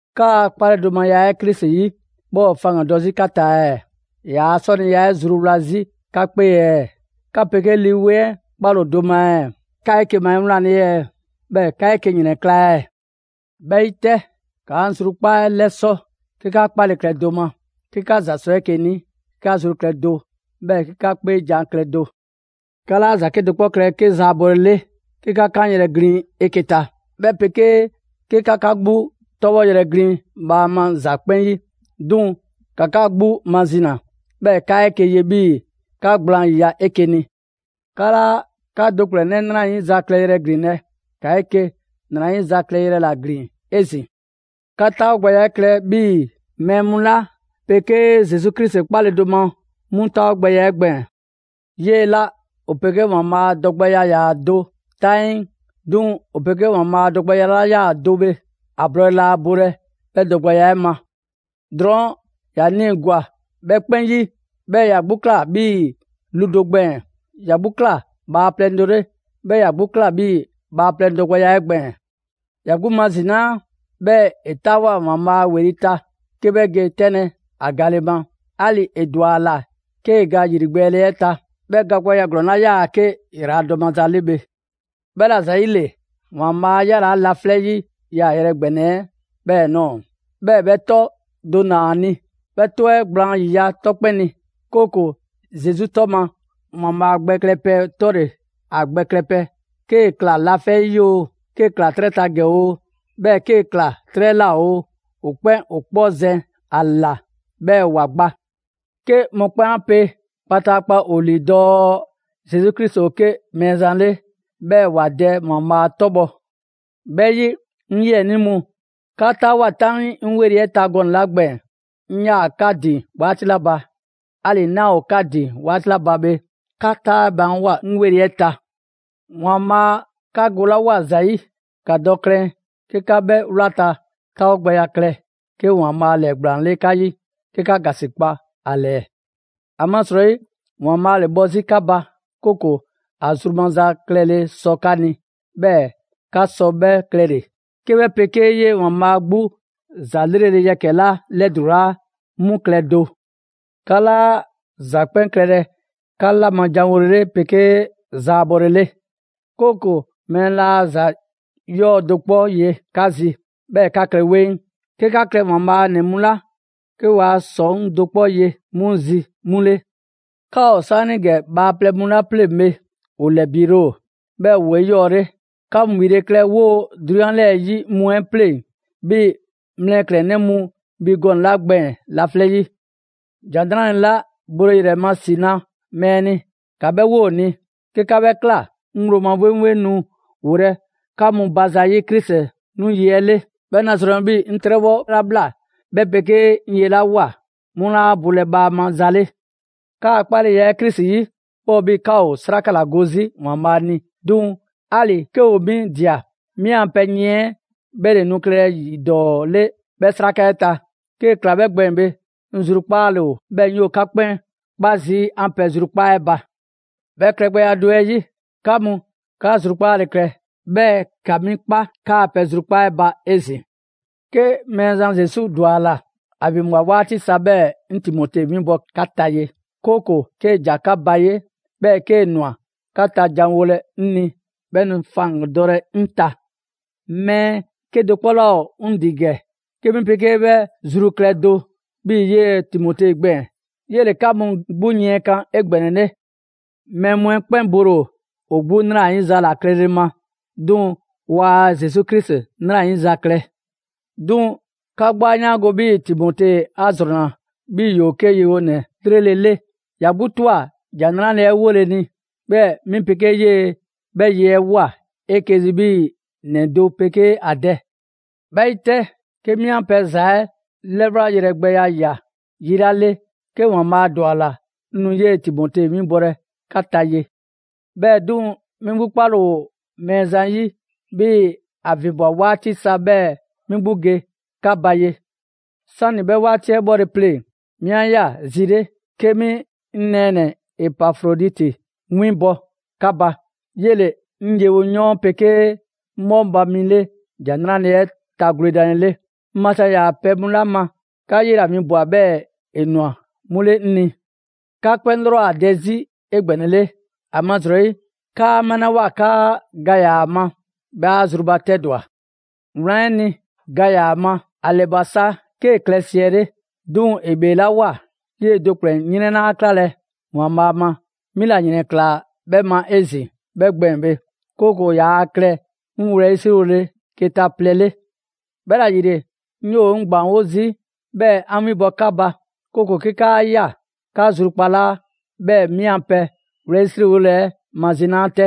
'Kaa 'kpaledomaya 'ɛ Krisi 'yi 'bhɛ ‑o faŋgandɔ 'zi 'ka ta ɛɛ? ‑Yaa' 'sɔniya 'ɛ zruwla 'zi ka 'kpee ɛɛ? 'Ka 'pegee Lii 'Weŋ 'ɛ 'kpale‑ ‑o do ma ɛɛ? 'Ka ‑o 'eke‑ ma 'ewlanle ɛɛ? 'Bhɛɛ‑ 'ka 'eke‑ ‑yrɛnkla' ɛɛ? 'Bhɛ 'yi 'tɛ, ‑ka 'an zrukpaa 'ɛ 'lɛsɔ 'ke 'ka 'kpale klɛ do ma, 'ke 'ka ‑za sɔ 'eke‑ ni, 'ke 'ka zru klɛ do, 'bhɛɛ‑ 'ke 'ka 'kpeejan‑ klɛ do. 'Ka 'laa ‑za 'kedo‑ 'kpɔ klɛlɛ 'ke zaabɔlele 'ke 'ka 'kanyrɛ‑ glin 'eke‑ ta, 'bhɛ 'pegee 'ke 'ka 'ka 'gbu 'tɔbhɔyrɛ ‑glin bhaama ‑za 'kpɛn 'yi; 'duŋ‑ ‑ka 'ka 'gbu mazina. 'Bhɛɛ‑ ‑ka 'eke‑ ye 'bhii‑ 'ka gblaan ‑yiya' 'eke‑ ni. 'Ka 'laa 'ka do ‑kplɛnnɛ' ‑nrayiza klɛyrɛ ‑glinlɛ', ‑ka 'eke‑ 'nrayiza klɛyrɛ ‑la ‑glin 'ezin‑. 'Ka 'taawogbɛya 'ɛ klɛ 'bhii‑ mɛɛ mu 'la 'pegee Zesu Krisi 'kpale‑ do ma 'mu 'taawogbɛya 'ɛ gbɛɛn‑. 'Yee‑ 'la ‑o 'pegee ‑Waanbhaa' dɔgbɛya ‑yaa do 'taŋii, 'duŋ‑ ‑o 'pegee ‑Waanbhaa' dɔgbɛya 'la 'yaa‑ do bhe, ‑a blɔɔle laa bolɛ 'bhɛ dɔgbɛya 'ɛ ma. Drɔɔn' ‑ya nii‑ ‑gwa 'bhɛ 'kpɛn 'yi, 'bhɛɛ‑ ‑ya 'gbu ꞊kla 'bhii‑ lu do gbɛɛn‑. ‑Ya 'gbu ꞊kla bhaaplɛŋ do 'le, 'bhɛɛ‑ ‑ya 'gbu ꞊kla 'bhii‑ bhaaplɛŋ dɔgbɛya 'ɛ gbɛɛn‑. ‑Ya 'gbu mazinaa, 'bhɛɛ‑ ‑e 'taawoa꞊ ‑Waanbhaa' ‑weli' ta 'ke 'bhɛ ge 'tɛnlɛ‑ ‑a gale ma. 'Ali‑ ‑e ‑dwa ‑a ‑la 'kee ga ‑yrigbɛɛle 'ɛ ta, ('bhɛ ga gbɛya ‑glɔɔn 'la 'yaa‑ 'ke ‑yraladɔ maza 'le bhe). 'Bhɛla‑ ‑zayile, ‑Waanbhaa' 'a 'yalaa‑ laflɛ' 'yi 'yaayrɛ‑ ‑gbɛnɛ 'ɛ 'bhɛɛ‑ ꞊nɔɔ. 'Bhɛɛ‑ 'bhɛ 'tɔ do ‑naa ‑a ni, 'bhɛ 'tɔ 'ɛ gblaan ‑yiya' 'tɔ 'kpɛn ni, 'kooko‑ Zesu 'tɔ ma, ‑Waanbhaa' gbɛ klɛpɛ 'tɔle‑ ‑a gbɛ klɛpɛ, 'kee‑ ꞊kla laflɛ' 'yi oo, 'kee‑ ꞊kla 'trɛ ta ‑gɛ oo, 'bhɛɛ‑ 'kee‑ ꞊kla 'trɛ ꞊la oo, ‑o 'kpɛn ‑o 'kpɔ zɛn ‑a ꞊la, 'bhɛɛ‑ ‑wa gba. 'Ke mɔkpɛn' 'a pe kpataakpa ‑o ‑lii dɔɔ Zesu Krisi ‑o 'ke Mɛɛzan 'le, 'bhɛɛ‑ ‑wa Dɛ ‑Waanbhaa' 'tɔbhɔ‑. 'Bhɛ 'yi, 'ŋ 'yiɛnii mu, 'ka 'taawoa꞊ 'taŋii 'ŋ 'weli‑ 'ɛ ta gɔnɛ‑ 'la gbɛɛn‑ 'ŋ 'yaa 'ka ‑din 'waati 'la ba, 'ali‑ 'naa ‑o 'ka ‑din 'waati 'la ba bhe, ‑ka 'taa baanwoa‑ 'ŋ 'weli‑ 'ɛ ta. ‑Waanbhaa' 'ka golawoa ‑za 'yi, ‑ka dɔ klɛn 'ke 'ka 'bhɛ 'wlata‑ 'taawogbɛya klɛ 'ke ‑Waanbhaa' ‑lɛɛgblaan 'le 'ka 'yi, 'ke 'ka ‑gasikpa ‑a ‑lɛɛ. ‑Amasrɔyi ‑Waanbhaa' ‑le bhɔ 'zi 'ka ba, 'kooko‑ ‑a zru maza klɛle 'sɔ 'ka ni, 'bhɛɛ‑ 'ka sɔ 'bhɛ klɛle‑, 'ke 'bhɛ 'pegee 'yee‑ ‑Waanbhaa' 'gbu ‑za 'lrele‑ yɛkɛ‑ 'la 'lɛdulaa 'mu klɛ do. 'Ka 'laa ‑za 'kpɛn klɛlɛ 'ka 'la ma janwole, 'pegee zaabɔlele. 'Kooko‑ mɛɛ 'laa ‑za 'yɔɔ‑ do 'kpɔ ye 'ka zi, 'bhɛɛ‑ 'ka klɛ 'weŋ. 'Ke 'ka klɛ ‑Waanbhaa' a ‑nɛ mu 'la 'ke waa ‑sɔŋ' do 'kpɔ ye 'mu zi 'mu 'le. 'Ka ‑o 'saanigɛ bhaaplɛŋ mu 'la 'pleŋ‑ bhe, ‑o ‑lɛbiile ‑o, 'bhɛɛ‑ ‑woo 'eyɔɔle. ‑Ka mu ‑bhile' klɛ 'woo‑ 'drunyan 'lɛɛ‑ 'yi mu 'ɛ 'pleŋ‑ 'bhii‑ mlɛklɛn‑ mu bhi gɔnɛ‑ 'la gbɛɛn‑ laflɛ' 'yi. ‑Jan 'Nrale‑ 'la bole ‑yrɛ ma ‑si na mɛɛ ni, ‑ka 'bhɛ 'wo ‑o ni. 'Ke 'ka 'bhɛ ꞊kla, 'ŋ ŋgblo ma 'wleŋwleŋ nu wolɛ 'ka mu ba zayi' Krisi 'nu yi 'ɛ 'le. 'Bhɛ nu ‑a zrɔnlɛ 'bhii‑ 'ŋ 'trɛbhɔ 'la ꞊bhla, 'bhɛ 'pegee 'ŋ ye 'la ꞊woa, 'mu 'laa bolɛ bhaama za 'le. 'Kaa‑ 'kpaleya 'ɛ Krisi 'yi, 'bhɛ ‑o 'bhii‑ 'ka ‑o 'sraka ‑la go 'zi ‑Waanbhaa' ni. 'Duŋ‑ 'ali‑ 'ke ‑o 'mi ꞊dia, 'mi 'an pɛ yiɛn 'ɛ 'bhɛ ‑le nu klɛlɛ ‑yi ‑dɔɔ 'le 'bhɛ 'sraka 'ɛ ta. 'Kee‑ ‑kla 'bhɛ gbɛɛn‑ bhe, 'ŋ zrukpaale ‑o, 'bhɛɛ‑ 'ŋ 'yoo‑ 'ka 'kpɛn 'kpa zii' 'an pɛ zrukpaa' 'ɛ ba. 'Bhɛ klɛgbɛya do 'ɛ 'yi, 'ka mu, 'ka zrukpaale klɛ, 'bhɛɛ‑ ‑ka 'mi 'kpa 'kaa pɛ zrukpaa' 'ɛ ba 'ezin‑. 'Ke Mɛɛzan Zesu ‑dwa ‑la, ‑a ‑vinbwa 'waati sa 'bhɛɛ‑ 'ŋ Timote 'winbɔ‑ 'ka ta ye. 'Kooko‑ 'kee‑ ‑ja 'ka ba ye, 'bhɛɛ‑ 'kee‑ ꞊nwa 'ka ta jan mu wolɛ 'ŋ ni, 'bhɛ nu faŋgandɔlɛ 'ŋ ta. Mɛɛ 'kedo‑ 'kpɔ 'laa ‑o 'ŋ ‑din ‑gɛ 'ke 'mi 'pegee 'bhɛ zru klɛ do 'bhii‑ 'yee‑ Timote gbɛɛn‑. 'Yele‑ 'ka mu 'gbu yiɛnkan 'egbɛnɛle. Mɛɛ mu 'ɛ 'kpɛn bole ‑o 'gbu 'nrayiza ‑la klɛle ma, 'duŋ‑ waa Zesu Krisi 'nrayiza klɛ. 'Duŋ‑ 'ka 'gbu 'a 'yaango‑ 'bhii‑ Timote 'a ‑zrɔnna 'bhii‑ ‑yoo 'ke yewonɛ 'lrele‑ 'le. ‑Ya 'gbu ꞊twa ‑Jan 'Nrale‑ 'ɛ 'wole ni, 'bhɛɛ‑ 'mi 'pegee 'yee‑ 'bhɛ ye 'ɛ ꞊woa 'eke‑ zi 'bhii‑ ‑nɛ do 'pegee ‑a dɛ. 'Bhɛ 'yi 'tɛ, 'ke 'mi 'an pɛ ‑za 'ɛ 'lɛwlagbɛya ꞊ya yi 'la 'le, 'ke ‑Waanbhaa' ‑dwa ‑a ‑la, 'ŋ nu 'yee Timote winbɔlɛ 'ka ta ye. 'Bhɛɛ‑ 'duŋ‑, 'mi 'gbu 'kpale‑ ‑o Mɛɛzan 'yi 'bhii‑ ‑a ‑vinbwa 'waati sa 'bhɛɛ‑ 'mi 'gbu ge 'ka ba ye. 'Sani‑ 'bhɛ 'waati 'ɛ 'bhɔle‑ pleŋ‑, 'mi 'a ꞊ya zi 'le 'ke 'mi 'ŋ nɛɛnɛ‑ Epafroditi winbɔ 'ka ba. 'Yele‑ 'ŋ yewoyɔɔn 'pegee 'ŋ 'bhɔŋba‑ mi 'le ‑Jan 'Nrale‑ 'ɛ ta gwledanlele. 'Ŋ maza ‑yaa pɛ mu 'la ma, 'ka 'yela‑ winbwa‑ 'bhɛɛ‑ ‑e ꞊nwa 'mu 'le 'ŋ ni. 'Ka 'kpɛn 'lrɔ ‑o ‑a dɛ 'zi 'egbɛnɛle, ‑amasrɔyi 'kaa 'malawoa 'kaa‑ ga ‑yaa ‑a ma, bhɛ 'a zrubatɛdwa. Wlan 'ɛ ni, ga ‑yaa ‑a ma, ‑a ‑lɛ ꞊bwa sa 'kee‑ klɛ siɛle'. 'Duŋ‑ ‑e ‑bheelawoa, 'yee‑ do ‑kplɛnnɛ' 'yrɛn 'laa 'klalɛ‑ ‑Waanbhaa' ma, 'mi ‑la ‑yrɛn ꞊klaa 'bhɛ ma 'ezin‑ 'bhɛ gbɛɛn‑ bhe. 'Kooko‑ yaa klɛ 'ŋ wlɛyisriwole keta plɛ 'le. 'Bhɛla‑ ‑yile, 'ŋ 'yoo‑ 'ŋ ‑gbaanwo' zii' 'bhɛɛ‑ 'an 'winbɔ‑ 'ka ba. 'Kooko‑ 'ke 'kaa ꞊ya 'ka zrukpalaa, 'bhɛɛ‑ 'mi a pɛ wlɛyisriwole 'ɛ mazinaa 'tɛ.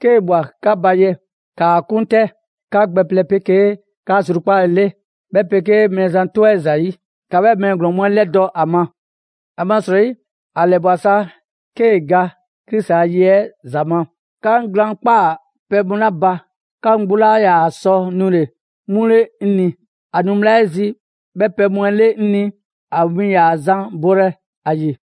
'Kee‑ ꞊bhwa 'ka ba ye, ‑kaa 'kun 'tɛ 'ka gbɛ plɛ 'pegee 'ka zrukpaale 'le, 'bhɛ 'pegee Mɛɛzan 'tɔ 'ɛ ‑zayi'. ‑Ka 'bhɛɛ‑ mɛɛ ‑glɔɔn mu 'ɛ 'lɛdɔ‑ a ma. ‑Amasrɔyi, ‑a ‑lɛ ꞊bwa sa 'kee‑ ga Krisi ‑a ye 'ɛ ‑za ma. 'Ka 'ŋ glaan' ꞊kpaa pɛ mu 'la ba, 'ka mu 'gbu 'laa ‑yaa sɔ nule‑ 'mu 'le 'ŋ ni; ‑a nu bhla 'ɛ zi 'bhɛ pɛ mu 'ɛ 'le 'ŋ ni, ‑a win ‑yaa zan bolɛ ‑a ‑yi.